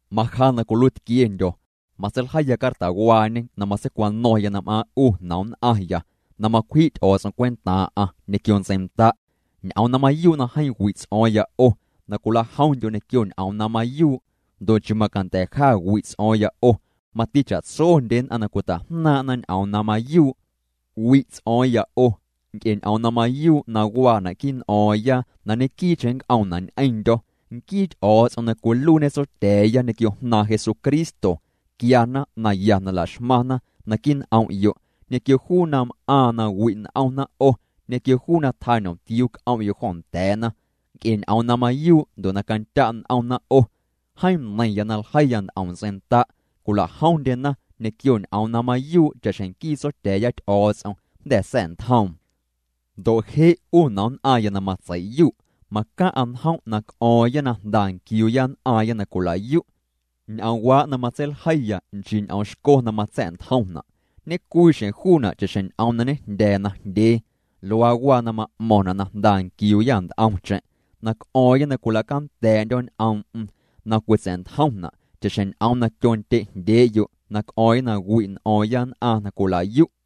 Maja na cwiluiitquiendyo̱, matseiljeiya cartawaañe na matseicwano̱ⁿya na m'aaⁿ' 'u nomnn'aⁿya na macwji' Ty'o̱o̱ts'om cwentaaⁿ'aⁿ ñequio ntseinda'. Ñ'oom na mayuu' na jeeⁿ wi' ts'o̱o̱ⁿya 'o na cwila'jomndyo' ñequio ñ'oom na mayuu'. Ndo' nchii macanda̱ ja wi' ts'o̱o̱ⁿya 'o mati cha'tsondye nn'aⁿ na cwita'jnaaⁿ'na ñ'oom na mayuu'. Wi' ts'o̱o̱ⁿya 'o nc'e ñ'oom na mayuu' na waana' quii' n'o̱o̱ⁿya na ñequii'cheⁿ nnc'oomna' ñ'eⁿndyo̱. Nquii Ty'o̱o̱ts'om na cwiluiiñe Tsotya̱a̱ya ñequio Jnaaⁿ Jesucristo quiana naya na la'xmaⁿna naquii' n'om'yo' ñequio juu na m'aaⁿ na wi' n'omna 'o ñequio juu na tjaa ñomtiuu c'om'yo' jo nda̱a̱na nc'e ñ'oom na mayuu' ndo' na candya' n'omna 'o. Jeeⁿ neiⁿya na ljeiya nt'om ntseinda' cwilajomndyena ñequio ñ'oom na mayuu' cha'xjeⁿ nquii Tsotya̱a̱ya Ty'o̱o̱ts'om jnda̱ sa̱'ntjoom. Ndo' je' 'u nomnn'aⁿya na matseiyu', macaⁿ'a njom' na c'o̱o̱ⁿya na jnda nquiuuya nn'aaⁿya na cwilayu'. Ñ'oomwaa' na matseiljeiya nchii ñ'oom xco na matsa̱'ntjomna', ñecwii xjeⁿ juuna' cha'xjeⁿ ñ'oom na ñejndya̱a̱ najndyee. Luaa waa na ma'mo̱ⁿna' na jnda nquiuuya nt'omcheⁿ, na c'o̱o̱ⁿya na cwila'canda̱a̱'ndyo̱ ñ'oom'm na cwitsa̱'ntjomna' cha'xjeⁿ ñ'oom na tyondye'jndyee'yo' na c'o̱o̱ⁿya na wi'n'o̱o̱ⁿya nn'aⁿ na cwila'yu'.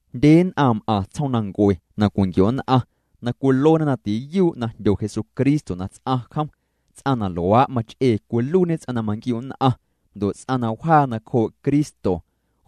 Jndye nn'aⁿ m'aⁿ tsjoomnancue na cwinquio'nn'aⁿ na cwiluena na tiyuu' na jndyo Jesucristo na ts'aⁿ jom. Ts'aⁿ na luaa' mach'ee cwiluiiñê ts'aⁿ na manquiu'nn'aⁿ, ndo' ts'aⁿ na wjaa nacjoo' Cristo.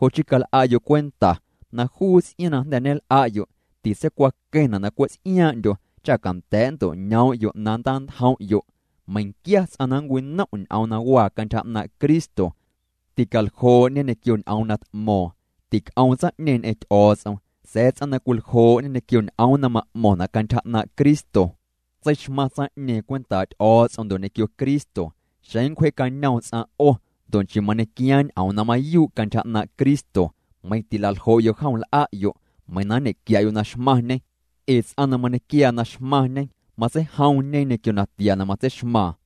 Jo' chii cal'a'yo' cwenta na juu ts'iaaⁿ na jnda̱ ñel'a'yo' titseicwaqueⁿna' na cwe' ts'iaaⁿ'ndyo cha canda̱a̱' nnto'ñoom'yo' na nntantjom'yo'. Meiⁿquia ts'aⁿ na nncwinom' ñ'oom na waa cantyja 'naaⁿ' Cristo, ticaljoo'ñe ñequio ñ'oom na t'mo̱o̱ⁿ, tic'oom tsaⁿ'ñeeⁿ ñ'eⁿ Ty'o̱o̱ts'om. Sa̱a̱ ts'aⁿ na cwiljoo'ñe ñequio ñ'oom na ma'mo̱ⁿna' cantyja 'naaⁿ' Cristo, tseixmaⁿ tsaⁿ'ñeeⁿ cwentaa' Ty'o̱o̱ts'om ndo' ñequio Cristo. Xeⁿ nncwjee'cañoom ts'aⁿ 'o ndo' nchii mañequiaaⁿ ñ'oom na mayuu' cantyja 'naaⁿ' Cristo, meiⁿ tilaljo'yo' jom l'a'yo' meiⁿ na nñequia'yo' na xmaⁿñê. Ee ts'aⁿ na mañequiaa na xmaⁿñê, matseijomñe ñequio natia na matseixmaaⁿ.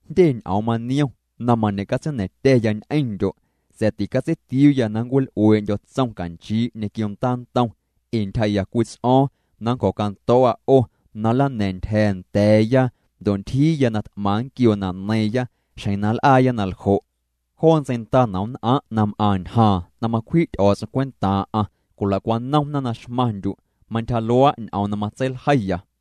Jndye ñ'oom maniom na mañe'catseina̱ⁿtya̱ya ñ'eⁿndyo'. Sa̱a̱ ticatseitiuuya na nncwil'uee'ndyo̱ tsom canchii' ñequio ndaantom. Ee ntyjaa'ya cwii ts'o̱o̱ⁿ na nncjo̱cando̱o̱'a 'o na nlana̱a̱ⁿ ntyja̱a̱ nda̱a̱ya. Ndo' ntyjiiya na t'maⁿ nquioo na neiiⁿya xjeⁿ na nl'aaya na ljo'. Joo ntseinda nomnn'aⁿ' na m'aⁿ ñjaaⁿ na macwji' Ty'o̱o̱ts'om cwentaaⁿ'aⁿ cwila'cwanomna na xmaⁿndyu'. Mantyja luaa' ñ'oom na matseiljeiya.